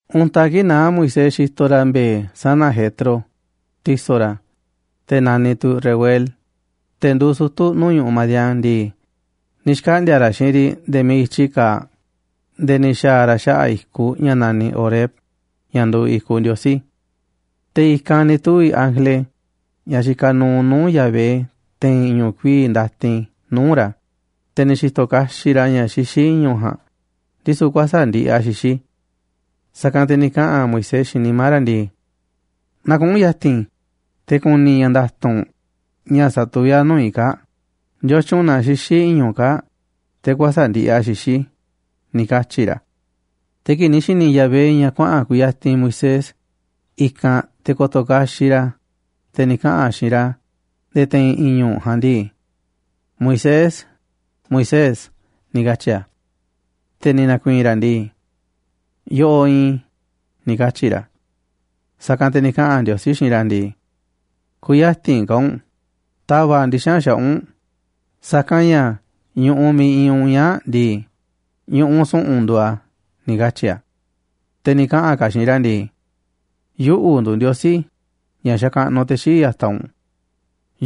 Untaꞌ kii̱ꞌ naá Moisés xitoꞌ ra̱ mbe̱e̱ sana̱ Jetro, ti̱so̱ ra̱, te̱ naniꞌ tu̱ Reuel, te̱ nduuꞌ sutu̱ nuu̱ꞌ ñu̱ꞌuꞌ Madián ndii, ni̱ xkaꞌndi̱a̱ ra̱ xiinꞌ riꞌ nde̱e̱ miiꞌ i̱tyi kaaꞌ nde̱e̱ ni̱ xa̱a̱ ra̱ xaꞌa̱ꞌ i̱kuꞌ ña̱ naniꞌ Horeb, ña̱ nduuꞌ i̱kuꞌ Ndiosí. Te̱ i̱kanꞌ ni̱ tuvi̱ ángele ña̱ xikaꞌ nuuꞌ nuu̱ꞌ Yahvé te̱i̱n i̱ñu̱ꞌ kuii̱ꞌ ndatin nuu̱ꞌ ra̱, te̱ ni̱ xi̱to̱ kaxiꞌ ra̱ ña̱ xixí i̱ñu̱ꞌ ja̱a̱nꞌ, ndisu̱ kuäsa̱ꞌ ndiꞌiꞌ a̱ xixí. Sa̱kanꞌ te̱ ni̱ kaꞌa̱n Moisés xiinꞌ nimá ra̱ ndii: “Na kuꞌu̱n ya̱ti̱n i̱ te̱ ku̱ni̱ i̱ ña̱ nda̱tu̱nꞌ ña̱ satuví a̱ nuu̱ꞌ i̱ kaa̱ꞌ, ¿ndiotyun na xixí i̱ñu̱ꞌ kaa̱ꞌ te̱ kuäsa̱ꞌ ndiꞌiꞌ a̱ xixí?”, ni̱ katyi̱ ra̱. Te̱ kii̱ꞌ ni̱ xi̱ni̱ Yahvé ña̱ kuaꞌa̱n kuyatinꞌ Moisés i̱kanꞌ te̱ ko̱to̱ kaxiꞌ ra̱, te̱ ni̱ kaꞌa̱n a̱ xiinꞌ ra̱ nde̱e̱ te̱i̱n i̱ñu̱ꞌ ja̱a̱nꞌ ndii: ―¡Moisés, Moisés! ―ni̱ katyi̱ a̱. Te̱ ni̱ na̱ku̱i̱i̱n ra̱ ndii: ―Yoꞌoꞌ iinꞌ i̱ ―ni̱ katyi̱ ra̱. Sa̱kanꞌ te̱ ni̱ kaꞌa̱n Ndiosí xiinꞌ ra̱ ndii: ―Kü̱ya̱ti̱n ka̱ u̱nꞌ, ta̱va̱ꞌ ndixa̱nꞌ xaꞌa̱ꞌ u̱nꞌ, sa̱kanꞌ ña̱ ñu̱ꞌuꞌ miiꞌ iinꞌ u̱nꞌ ñaa̱ꞌ ndii, ñu̱ꞌuꞌ su̱ꞌu̱n nduuꞌ a̱ ―ni̱ katyi̱ a̱. Te̱ ni̱ kaꞌa̱n ka̱ a̱ xiinꞌ ra̱ ndii: ―Yuꞌu̱ nduuꞌ Ndiosí ña̱ xakaꞌnuꞌ te̱ xii̱ꞌ ya̱taꞌ u̱nꞌ.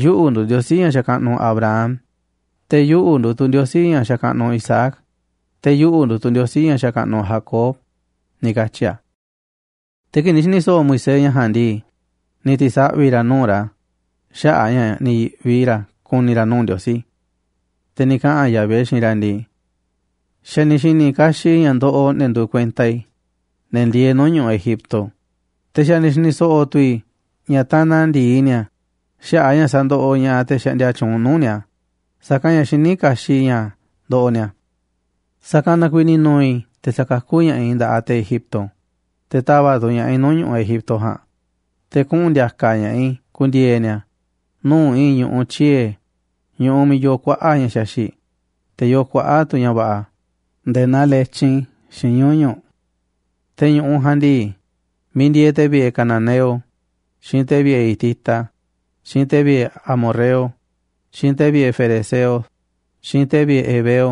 Yuꞌu̱ nduuꞌ Ndiosí ña̱ xakaꞌnuꞌ Abraham, te̱ yuꞌu̱ nduuꞌ tu̱ Ndiosí ña̱ xakaꞌnuꞌ Isaac, te̱ yuꞌu̱ nduuꞌ tu̱ Ndiosí ña̱ xakaꞌnuꞌ Jacob ―ni̱ katyi̱ a̱. Te̱ kii̱ꞌ ni̱ xi̱ni̱ so̱ꞌo̱ Moisés ña̱ ja̱a̱nꞌ ndii, ni̱ ti̱saꞌvi̱ ra̱ nuu̱ꞌ ra̱ xaꞌa̱ꞌ a̱ ña̱ ni̱ yi̱ꞌvi ra̱ ku̱ni̱ ra̱ nuu̱ꞌ Ndiosí. Te̱ ni̱ kaꞌa̱n Yahvé xiinꞌ ra̱ ndii: ―Xa̱ ni̱ xi̱ni̱ kaxiꞌ i̱ ña̱ ndoꞌoꞌ ne̱ nduuꞌ kuenta i̱, ne̱ ndieeꞌ nuu̱ꞌ ñu̱ꞌuꞌ Egipto. Te̱ xa̱ ni̱ xi̱ni̱ so̱ꞌo̱ tu̱ i̱ ña̱ tanaꞌ ndi̱i ni̱a̱ xaꞌa̱ꞌ a̱ ña̱ sa̱ndoꞌoꞌ ña̱ꞌaꞌ te̱ xaꞌndia tyuunꞌ nuu̱ꞌ ni̱a̱, sa̱kanꞌ ña̱ xiní kaxiꞌ i̱ ña̱ ndoꞌoꞌ ni̱a̱. Sa̱kanꞌ na kuiiꞌ ni̱ nu̱u̱ i̱ te̱ sa̱kakú ña̱ꞌaꞌ i̱ nda̱ꞌaꞌ te̱ Egipto, te̱ ta̱va̱ꞌ tu̱ ña̱ꞌaꞌ i̱ nuu̱ꞌ ñu̱ꞌuꞌ Egipto ja̱a̱nꞌ, te̱ kuꞌu̱n ndi̱a̱ka̱ ña̱ꞌaꞌ i̱ ku̱ndi̱e̱e̱ ni̱a̱ nuu̱ꞌ i̱i̱n ñu̱ꞌuꞌ tyiee̱, ñu̱ꞌuꞌ miiꞌ yoo kuaꞌa̱ꞌ ña̱ xaxi̱ꞌ, te̱ yoo kuaꞌa̱ꞌ tu̱ ña̱ va̱ꞌa̱ nde̱e̱ naa letyin, xiinꞌ ñuñu̱ꞌ. Te̱ ñu̱ꞌuꞌ ja̱a̱nꞌ ndii, miiꞌ ndieeꞌ te̱ vi̱ꞌe̱ cananeo, xiinꞌ te̱ vi̱ꞌe̱ hitita, xiinꞌ te̱ vi̱ꞌe̱ amorreo, xiinꞌ te̱ vi̱ꞌe̱ ferezeo, xiinꞌ te̱ vi̱ꞌe̱ heveo,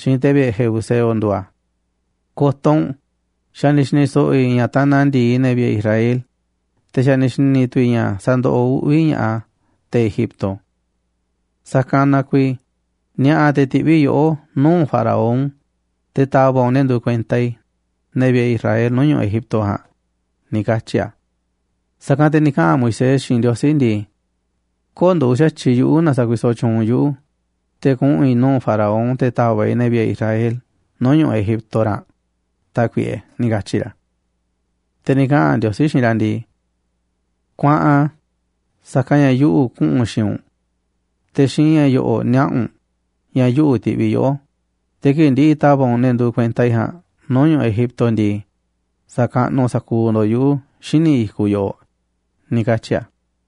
xiinꞌ te̱ vi̱ꞌe̱ jebuseo nduuꞌ a̱. Ko̱to̱ u̱nꞌ, xa̱ ni̱ xi̱ni̱ so̱ꞌo̱ i̱ ña̱ tanaꞌ ndi̱i ne̱ vi̱ꞌe̱ Israel, te̱ xa̱ ni̱ xi̱ni̱ tu̱ i̱ ña̱ sandoꞌoꞌ uꞌvi̱ va̱ ña̱ꞌaꞌ te̱ Egipto. Sa̱kanꞌ na kuiiꞌ ni̱a̱ꞌa̱ te̱ ti̱ꞌviꞌ i̱ yoꞌó nuu̱ꞌ Faraón, te̱ ta̱va̱ꞌ u̱nꞌ ne̱ nduuꞌ kuenta i̱, ne̱ vi̱ꞌe̱ Israel, nuu̱ꞌ ñu̱ꞌuꞌ Egipto ja̱a̱nꞌ ―ni̱ katyi̱ a̱. Sa̱kanꞌ te̱ ni̱ kaꞌa̱n Moisés xiinꞌ Ndiosí ndii: ―Köo̱ꞌ nduuꞌ xa̱tyiꞌ yuꞌu̱ na sa̱kuisoꞌ tyuunꞌ u̱nꞌ yuꞌu̱ te̱ kuꞌu̱n i̱ nuu̱ꞌ Faraón, te̱ ta̱va̱ꞌ i̱ ne̱ vi̱ꞌe̱ i̱ Israel nuu̱ꞌ ñu̱ꞌuꞌ Egipto ra̱nꞌ, Tákuiꞌe ―ni̱ katyi̱ ra̱. Te̱ ni̱ kaꞌa̱n Ndiosí xiinꞌ ra̱ ndii: ―Kuaꞌan, sa̱kanꞌ ña̱ yuꞌu̱ kuꞌu̱n xiinꞌ u̱nꞌ, te̱ xiinꞌ ña̱ yo̱ꞌo̱ꞌ niaꞌa̱ u̱nꞌ ña̱ yuꞌu̱ tiꞌviꞌ yoꞌó. Te̱ kii̱ꞌ ndi̱ꞌi̱ ta̱va̱ꞌ u̱nꞌ ne̱ nduuꞌ kuenta i̱ ja̱a̱nꞌ nuu̱ꞌ ñu̱ꞌuꞌ Egipto ndii, sa̱kaꞌnuꞌ sa̱kuuꞌ ndo̱ꞌ yuꞌu̱ xíniꞌ i̱kuꞌ yoꞌoꞌ ―ni̱ katyi̱ a̱.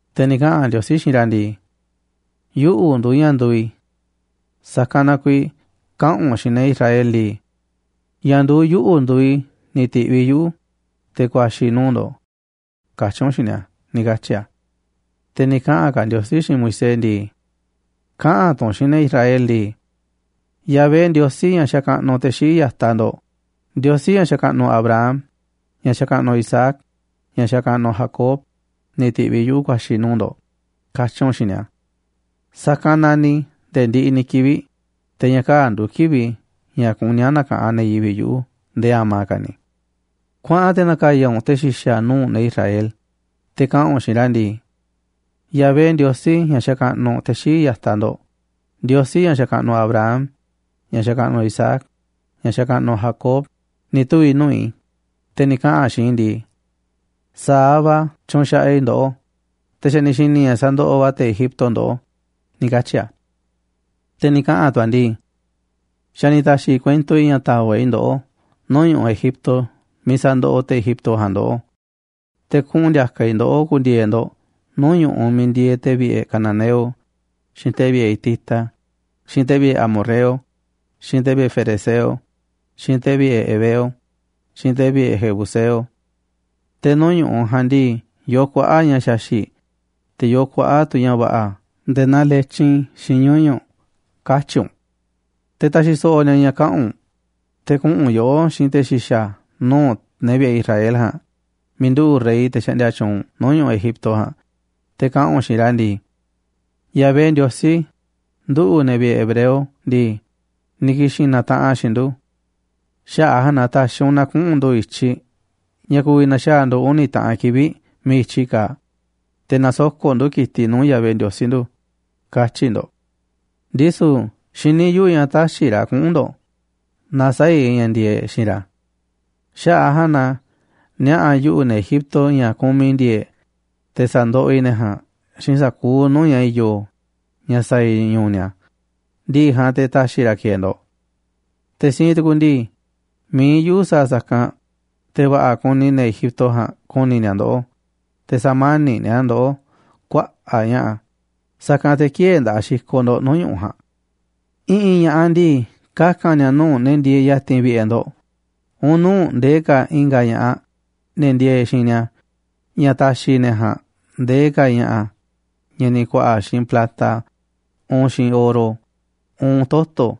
Te̱ ni̱ kaꞌa̱n Ndiosí xiinꞌ ra̱ ndii: ―YUꞌU̱ NDUUꞌ ÑA̱ NDUUꞌ I̱. Sa̱kanꞌ na kuiiꞌ kaꞌa̱n u̱nꞌ xiinꞌ ne̱ Israel ndii: “Ña̱ nduuꞌ YUꞌU̱ NDUUꞌ I̱ ni̱ ti̱ꞌviꞌ yuꞌu̱, te̱ ku̱a̱xi̱ i̱ nuu̱ꞌ ndo̱ꞌ”, katyi̱ u̱nꞌ xiinꞌ ni̱a̱ ―ni̱ katyi̱ a̱. Te̱ ni̱ kaꞌa̱n ka̱ Ndiosí xiinꞌ Moisés ndii: ―Kaꞌa̱n tu̱ u̱nꞌ xiinꞌ ne̱ Israel ndii: “Yahvé Ndiosí, ña̱ xakaꞌnuꞌ te̱ xii̱ꞌ ya̱taꞌ ndo̱ꞌ, Ndiosí ña̱ xakaꞌnuꞌ Abraham, ña̱ xakaꞌnuꞌ Isaac, ña̱ xakaꞌnuꞌ Jacob, ni̱ ti̱ꞌviꞌ yuꞌu̱ ku̱a̱xi̱ i̱ nuu̱ꞌ ndo̱ꞌ”, katyi̱ u̱nꞌ xiinꞌ ni̱a̱. Sa̱kanꞌ naniꞌ i̱ nde̱e̱ ndiꞌiꞌ ni̱ kivi̱ꞌ, te̱ ña̱ kaa̱ꞌ nduuꞌ kivi̱ꞌ i̱ ña̱ kuní a̱ na̱ka̱ꞌanꞌ ne̱ yivi̱ꞌ yuꞌu̱ nde̱e̱ a̱ma̱ ka̱ ni̱. ’Kuaꞌan te̱ na̱ka̱ya̱ u̱nꞌ te̱ xi̱xa̱ nuu̱ꞌ ne̱ Israel, te̱ kaꞌa̱n u̱nꞌ xiinꞌ ra̱ ndii: “Yahvé Ndiosí, ña̱ xakaꞌnuꞌ te̱ xii̱ꞌ ya̱taꞌ ndo̱ꞌ, Ndiosí ña̱ xakaꞌnuꞌ Abraham, ña̱ xakaꞌnuꞌ Isaac, ña̱ xakaꞌnuꞌ Jacob, ni̱ tuvi̱ nuu̱ꞌ i̱, te̱ ni̱ kaꞌa̱n a̱ xiinꞌ i̱ ndii: ‘Sa̱aꞌ va̱ tyunxaꞌaꞌ i̱ ndoꞌó, te̱ xa̱ ni̱ xi̱ni̱ i̱ ña̱ sandoꞌoꞌ va̱ te̱ Egipto ndoꞌó’, ni̱ katyi̱ a̱. Te̱ ni̱ kaꞌa̱n tu̱ a̱ ndii: ‘Xa̱ ni̱ ta̱xi̱ i̱ kuento i̱ ña̱ ta̱va̱ꞌ ndoꞌó nuu̱ꞌ ñu̱ꞌuꞌ Egipto miiꞌ sa̱ndoꞌoꞌ te̱ Egipto ja̱a̱nꞌ ndoꞌó, te̱ kuꞌu̱n ndi̱a̱ka̱ i̱ ndoꞌó ku̱ndi̱e̱e̱ ndo̱ꞌ nuu̱ꞌ ñu̱ꞌuꞌ miiꞌ ndieeꞌ te̱ vi̱ꞌe̱ cananeo, xiinꞌ te̱ vi̱ꞌe̱ hitita, xiinꞌ te̱ vi̱ꞌe̱ amorreo, xiinꞌ te̱ vi̱ꞌe̱ ferezeo, xiinꞌ te̱ vi̱ꞌe̱ heveo, xiinꞌ te̱ vi̱ꞌe̱ jebuseo. Te̱ nuu̱ꞌ ñu̱ꞌuꞌ ja̱a̱nꞌ ndii, yoo kuaꞌa̱ꞌ ña̱ xaxi̱ꞌ, te̱ yoo kuaꞌa̱ꞌ tu̱ ña̱ va̱ꞌa̱ nde̱e̱ naa letyin xiinꞌ ñuñu̱ꞌ’”, katyi̱ u̱nꞌ. ’Te̱ ta̱xi̱ so̱ꞌo̱ ni̱a̱ ña̱ kaꞌa̱n u̱nꞌ, te̱ kuꞌu̱n yoꞌó xiinꞌ te̱ xi̱xa̱ nuu̱ꞌ ne̱ vi̱ꞌe̱ Israel ja̱a̱nꞌ miiꞌ nduꞌu̱ꞌ rey, te̱ xaꞌndia tyuunꞌ nuu̱ꞌ ñu̱ꞌuꞌ Egipto ja̱a̱nꞌ, te̱ kaꞌa̱n u̱nꞌ xiinꞌ ra̱ ndii: “Yahvé, Ndiosí nduꞌu̱, ne̱ vi̱ꞌe̱ hebreo ndii, ni̱ ki̱xi̱n na̱taꞌanꞌ a̱ xiinꞌ ndu̱. Xaꞌa̱ꞌ a̱ ja̱a̱nꞌ na ta̱xi̱ u̱nꞌ na kuꞌu̱n ndu̱ i̱tyiꞌ ña̱ ku̱vi̱ na̱xaa̱ ndu̱ uni̱ taꞌan kivi̱ꞌ miiꞌ i̱tyi kaaꞌ, te̱ na̱soko̱ꞌ ndu̱ ki̱tiꞌ nuu̱ꞌ Yahvé, Ndiosí ndu̱,” katyi̱ ndo̱ꞌ. Ndisu̱ xiní yuꞌu̱ ña̱ tä̱xi̱ ra̱ kuꞌu̱n ndo̱ꞌ naaꞌ sä̱a̱ i̱ ña̱ ndi̱e̱eꞌ xiinꞌ ra̱. Xaꞌa̱ꞌ a̱ ja̱a̱nꞌ na niaꞌa̱ yuꞌu̱ ne̱ Egipto ña̱ kumiꞌ i̱ ndi̱e̱e̱ꞌ, te̱ sa̱ndoꞌoꞌ i̱ ne̱ ja̱a̱nꞌ xiinꞌ sa̱kuuꞌ nuu̱ꞌ ña̱ i̱yo̱, ña̱ sa̱a̱ i̱ ñu̱u̱ ni̱a̱, ndi̱ꞌi̱ ja̱a̱nꞌ te̱ ta̱xi̱ ra̱ ki̱e̱e̱ ndo̱ꞌ. ’Te̱ siinꞌ tu̱ku̱ ndii, mi̱iꞌ yuꞌu̱ sa̱a̱ sa̱kanꞌ, te̱ va̱ꞌa̱ kuni ne̱ Egipto ja̱a̱nꞌ ku̱ni̱ ni̱a̱ ndoꞌó, te̱ sa̱mani̱ꞌ ni̱a̱ ndoꞌó kuaꞌa̱ꞌ ña̱ꞌa̱, sa̱kanꞌ te̱ kï̱e̱e̱ nda̱ꞌaꞌ xikoꞌ ndo̱ꞌ nuu̱ꞌ ñu̱ꞌuꞌ ja̱a̱nꞌ. I̱ꞌi̱n ña̱ꞌaꞌ ndii, kaka̱n ni̱a̱ nuu̱ꞌ ne̱ ndieeꞌ ya̱ti̱n vi̱ꞌe̱ ndo̱ꞌ, uun nuu̱ꞌ ndee ka̱ i̱nga̱ ña̱ꞌaꞌ, ne̱ ndieeꞌ xiinꞌ ni̱a̱, ña̱ ta̱xi̱ ne̱ ja̱a̱nꞌ ndee ka̱ ña̱ꞌa̱ ña̱ ni̱ ku̱a̱ꞌa̱ xiinꞌ plata, uun xiinꞌ oro, uun toto̱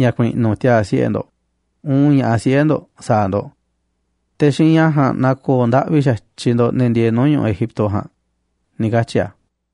ña̱ ku̱i̱ꞌnu̱ tiaa̱ siꞌe̱ ndo̱ꞌ, uun ña̱ꞌaꞌ siꞌe̱ ndo̱ꞌ sa̱a̱ ndo̱ꞌ. Te̱ xiinꞌ ña̱ ja̱a̱nꞌ na̱ko̱o̱ ndaꞌvi xa̱tyiꞌ ndo̱ꞌ ne̱ ndieeꞌ nuu̱ꞌ ñu̱ꞌuꞌ Egipto ja̱a̱nꞌ ―ni̱ katyi̱ a̱.